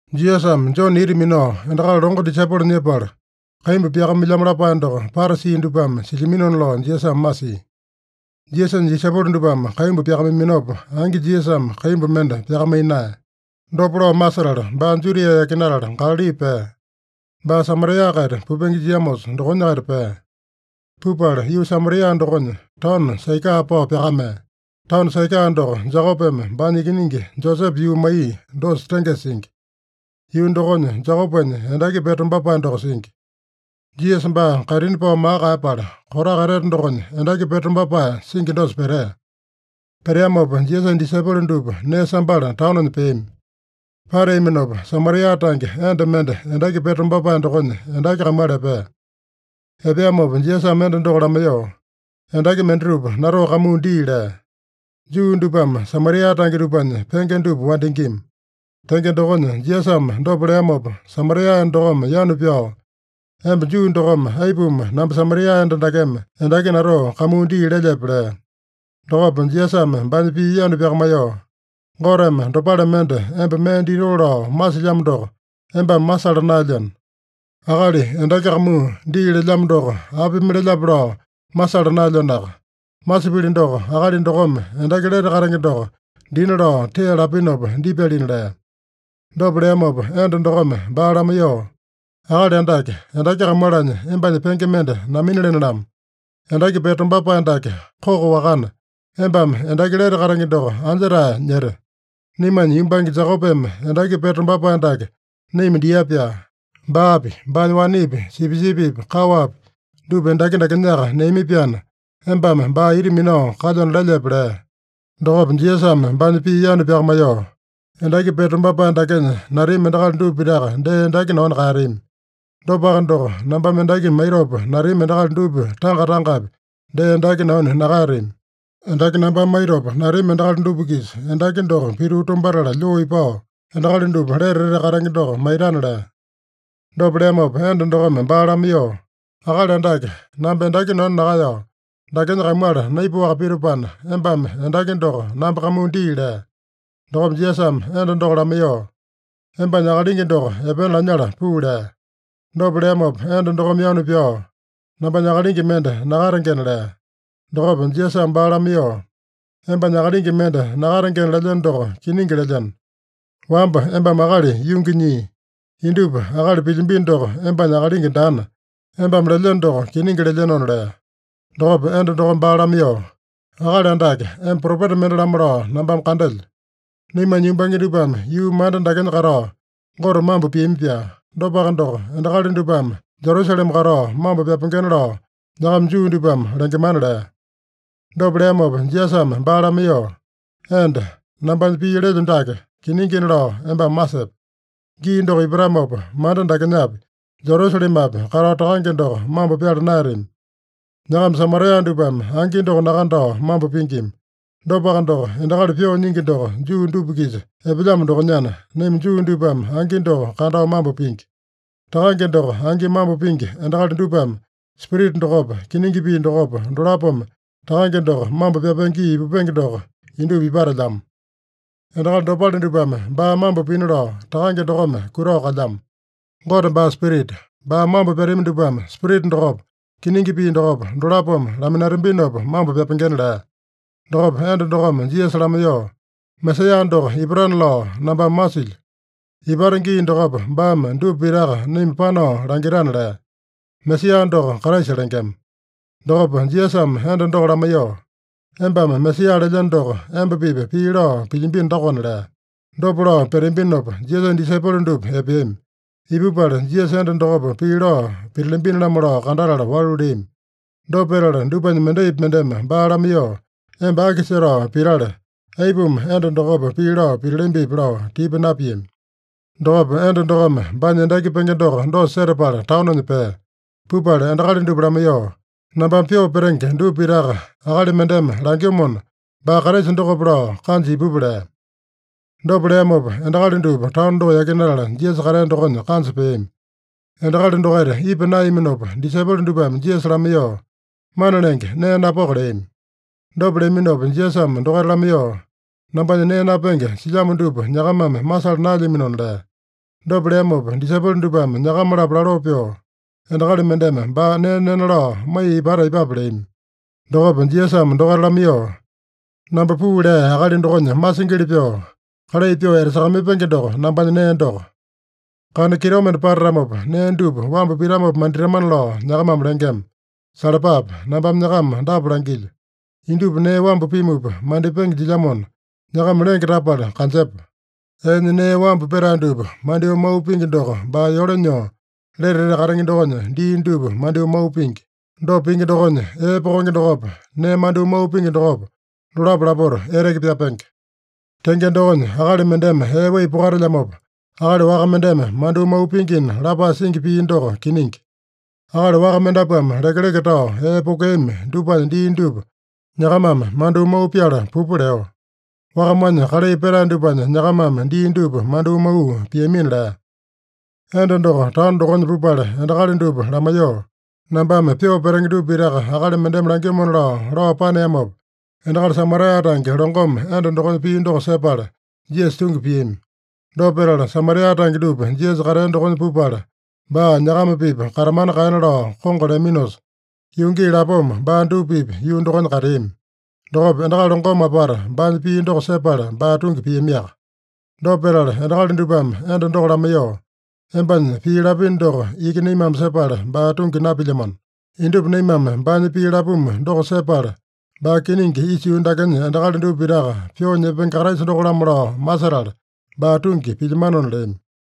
Jisasame Jone ita minao endakali longo disaipolo nyepala, kaimbu pyakamailyamo lapae doko Parasi dupame silyaminona lao Jisasame masia. (Jisasanya disaipolo dupame kaimbu pyakamaiyaminopa, angi Jisasame kaimbu mende pyakamaiya naeya.) Dopa lao masetala, baa Judia yakinatala Galali pea. Baa Samaria-kaita pupenge jiamosa dokonya-kaita pea. Pupala yuu Samaria dokonya, taono Saikaa pao pyakamea. Taono Saikaa doko, Jekopeme baanya ikiningi Josepe yuu maiya dosa tengesa singi. Yuu dokonya Jekopenya endaki pete tombapae doko singi. Jisasa baa kaitini pao maka kaeyapala, kotaka etete dokonya endaki pete tombapae singi dosa petea. Peteamopa Jisasanya disaipolo dupa nee sambala taononya peami. Pateaminopa Samaria tange enda mende endaki pete tombapae dokonya endaki kamuala epea. Epeamopa Jisasame enda doko lamaiyoo, “Endaki mendatupa natoo kamuu dii” lea. Juu dupame Samaria tange dupanya penge dupa wandingima. Tenge dokonya, Jisasame dopa leamopa Samaria enda dokome yanu pyao, “Emba Juu dokome aipuma namba Samaria enda dakeme endaki natoo kamuu dii lelyepe?” lea. Dokopa Jisasame baanya pii yanu pyakamaiyoo, “Goteme dopale mende emba mee ditoo lao masilyamo doko embame masala naelyeno. Akali endaki kamuu dii lelyamo doko apimi lelyape lao masala naelyenoaka. Masipili doko, akali dokome endaki lete katenge doko dina lao tee lapinopa dipyalina” lea. Dopa leamopa enda dokome baa lamaiyoo, “Akali Andake, endaki kamualanya embanya penge mende naminalene-lamo. Endaki pete tombapae dake koko-wakana, embame endaki lete katenge doko anja-tae nyete? Naimanya yumbange Jekopeme endaki pete tombapae dake naima dia-pyaa. Baapi, baanya wanepi, sipisipipi, kaowapi dupa endaki dakenyaka neami-pyaana, embame baa ita minao kalyona lelyepe?” lea. Dokopa Jisasame baanya pii yanu pyakamaiyoo, “Endaki pete tombapae dakenya natami endakali dupa pitaka dee endaki nanu kaeyatami. Dopaka doko, nambame endaki maitopa natami endakali dupa tanga-tangapi dee endaki nanu nakaeyatami. Endaki nambame maitopa natami endakali dupa-kisa endaki doko pituu tumbatala lyoo ipao, endakali dupa lete etete katenge doko maitana” lea. Dopa leamopa enda dokome baa lamaiyoo, “Akali Andake, namba endaki nanu nakaeyao, dakenya kamuala naipaowaka pitopana, embame endaki doko namba kamuu dii” lea. Dokopa Jisasame enda doko lamaiyoo, “Embanya akalingi doko epena lanyala puu” lea. Dopa leamopa enda dokome yanu pyao, “Nambanya akalingi mende nakatengena” lea. Dokopa Jisasame baa lamaiyoo, “Embanya akalingi mende nakatengena lelyeno doko kiningi lelyeno. Wamba embame akali yungi nyii. Indupa akali pilyambino doko embanya akalingi daana, embame lelyeno doko kiningi lelyenona” lea. Dokopa enda dokome baa lamaiyoo, “Akali Andake, emba propeta mende-lamo lao nambame kandelyo. Naimanya yumbange dupame yuu manda dakenya katao Gote mambo piami-pyaa. Dopaka doko, endakali dupame Jerusalema katao mambo pyapengena lao nyakama Juu dupame lengemana” lea. Dopa leamopa Jisasame baa lamaiyoo, “Enda, nambanya pii lelyo dake kiningina lao embame masepe: Gii doko ipatamopa, manda dakenyapi, Jerusalemapi katao Takange doko mambo pyala naeyatami. Nyakama Samaria dupame angi doko nakandao mambo pingima. Dopaka doko, endakali pyoo nyingi doko Juu dupa-kisa epelyamo dokonyana, naima Juu dupame angi doko kandao mambo pingi. Takange doko angi mambo pingi endakali dupame Spirita dokopa, kiningi pii dokopa, dolapome Takange doko mambo pyapenge gii ipupenge doko indupa ipatelyamo. Endakali dopale dupame baa mambo pina lao Takange dokome kutao kalyamo. Gote baa spirita. Baa mambo pyatami dupame Spirita dokopa, kiningi pii dokopa, dolapome laminatambinopa mambo pyapengena” lea. Dokopa enda dokome Jisasa lamaiyoo, “Mesaeya doko ipatana lao nambame masilyo. Ipata gii dokopa, baame dupa pitaka naima panao langitana” lea. (Mesaeya doko Kraisa lengema.) Dokopa Jisasame enda doko lamaiyoo, “Embame Mesaeya lelyeno doko, emba-pipa pii lao pilyambino dokona” lea. Dopa lao peteambinopa, Jisasanya disaipolo dupa epeami. Ipupala, Jisasa enda dokopa pii lao pitalambini-lamo lao kandatala walu leami. Dopa petala dupanya mendaipi mendeme baa lamaiyoo, “Emba aki setao pitale? Aipuma enda dokopa pii lao pitalambipi?” lao tipa napiami. Dokopa enda dokome baanya endaki penge doko dosa setapala taononya pea. Pupala endakali dupa lamaiyoo, “Nambame pyoo petenge dupa pitaka akali mendeme langyomona, baa Kraisa dokope lao kanja ipupa” lea. Dopa leamopa endakali dupa taono doko yakinatala, Jisasa katea dokonya kanja peami. Endakali dokaita ipa naeyaminopa, disaipolo dupame Jisasa lamaiyoo, “Mana Lenge, nee napoko” leami. Dopa leaminopa Jisasame dokaita lamaiyoo, “Nambanya nee napenge silyamo dupa nyakamame masala naelyaminona” lea. Dopa leamopa disaipolo dupame nyakama-lapo laloo pyoo, “Endakali mendeme baa nee nena lao maiya ipata aipape?” leami. Dokopa Jisasame dokaita lamaiyoo, “Namba puu lea Akali dokonya masingili pyoo, kalai pyoo etasakamaipenge doko nambanya nee doko. ‘Kana kitomende patatamopa, nee dupa wambu pitamopa manditamana’ lao nyakamame lengema. Salapape! Nambame nyakama dapa langilyo: Indupa nee wambu pimupa mandipenge jilyamona, nyakama lenge tapala kanjepa. Eenya nee wambu petae dupa mandyoo mau pingi doko baa yole nyoo, lete etete katenge dokonya dii dupa mandyoo mau pingi. Dopa pingi dokonya, ee pokenge dokopa, nee mandyoo mau pingi dokopa, dolapo lapota eteke pyapenge. Tenge dokonya, akali mendeme ee wai pokatelyamopa, akali waka mendeme mandyoo mau pingina lapae singi pii doko kiningi. Akali waka mendapuame lekeleke tao ee pokeami dupanya dii dupa nyakamame mandyoo mau pyala pupa leo. Wakamanya kalai petae dupanya nyakamame dii dupa mandyoo mau piamina” lea. Enda doko taono dokonya pupala endakali dupa lamaiyoo, “Nambame pyoo petenge dupa pitaka akali mendeme langyomona” lao, lao paneamopa, endakali Samaria tange longome enda dokonya pii doko sepala, Jisasa tungi piami. Dopa petala, Samaria tange dupa Jisasa katea dokonya pupala, baa nyakama-pipa katamana kaena lao kongo leaminosa, yuu gii lapoma baa dupa-pipa yuu dokonya kateami. Dokopa endakali longome apata baanya pii doko sepala, baa tungi piamiaka. Dopa petala endakali dupame enda doko lamaiyoo, “Embanya pii lapino doko iki naimame sepala baa tungi napilyamano. Indupa naimame baanya pii lapumu doko sepala, baa kiningi isa yuu dakenya endakali dupa pitaka Pyoo Nyepenge Kraisa doko-lamo lao masetala, baa tungi pilyamanona” leami.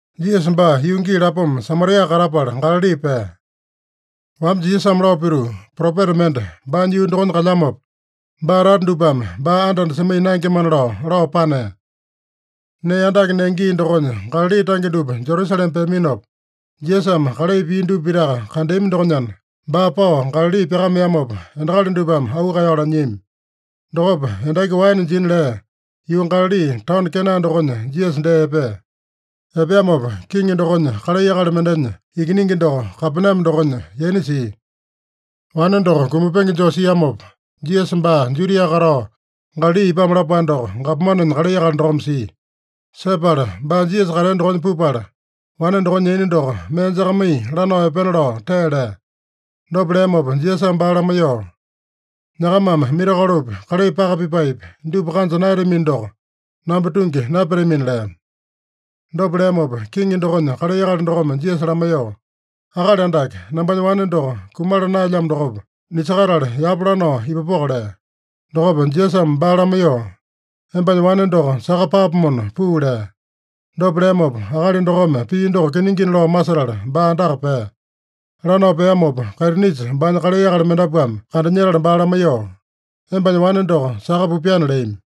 Jisasa baa yuu gii lapoma Samaria katapala Galali pea. (Wamba Jisasame lao pituu, “Propeta mende baanya yuu dokonya kalyamopa, baa tata dupame baa anda-anda semaiya naengemana” lao, lao panea.) Nee andake nenge gii dokonya Galali tange dupa Jerusalema peaminopa, Jisasame kalai pia dupa pitaka kandeami dokonyana, baa pao Galali pyakameamopa, endakali dupame auu kaeyao lanyiami. Dokopa endaki waene jina lea yuu Galali, taono Kena dokonya Jisasa dee epea. Epeamopa kiŋi dokonya kalai akali mendenya ikiningi doko Kapename dokonya yaina sia. Wane doko kumapenge joo siamopa, Jisasa baa Judia katao Galali ipamo lapae doko gapomanenya kalai akali dokome sia. Sepala baa Jisasa katea dokonya pupala, wane dokonya yaina doko mee jakamaiya lanao epena lao tee lea. Dopa leamopa Jisasame baa lamaiyoo, “Nyakamame mirakolopi, kalai paka pipaepi, dupa kanja naeyatamino doko, namba tungi napyatamina” lea. Dopa leamopa, kiŋi dokonya kalai akali dokome Jisasa lamaiyoo, “Akali Andake, nambanya wane doko kumala naelyamo dokopa, nisakatale yapa lanao ipupoko” lea. Dokopa Jisasame baa lamaiyoo, “Embanya wane doko saka paapomona puu” lea. Dopa leamopa, akali dokome pii doko kiningina lao masetala baa andaka pea. Lanao peamopa, kaitinisa baanya kalai akali mendapuame kandanyetala baa lamaiyoo, “Embanya wane doko saka pupyana” leami.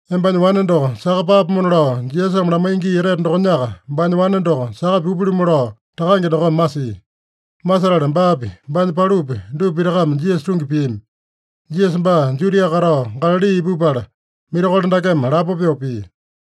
“Embanya wane doko saka paapomona” lao Jisasame lamaiya gii etete dokonyaka baanya wane doko saka pupya-lumu lao takange dokome masia. Masetala baapi, baanya palupi, dupa pitakame Jisasa tungi piami. Jisasa baa Judia katao Galali ipupala, mirakolo dakeme lapo pyoo pia.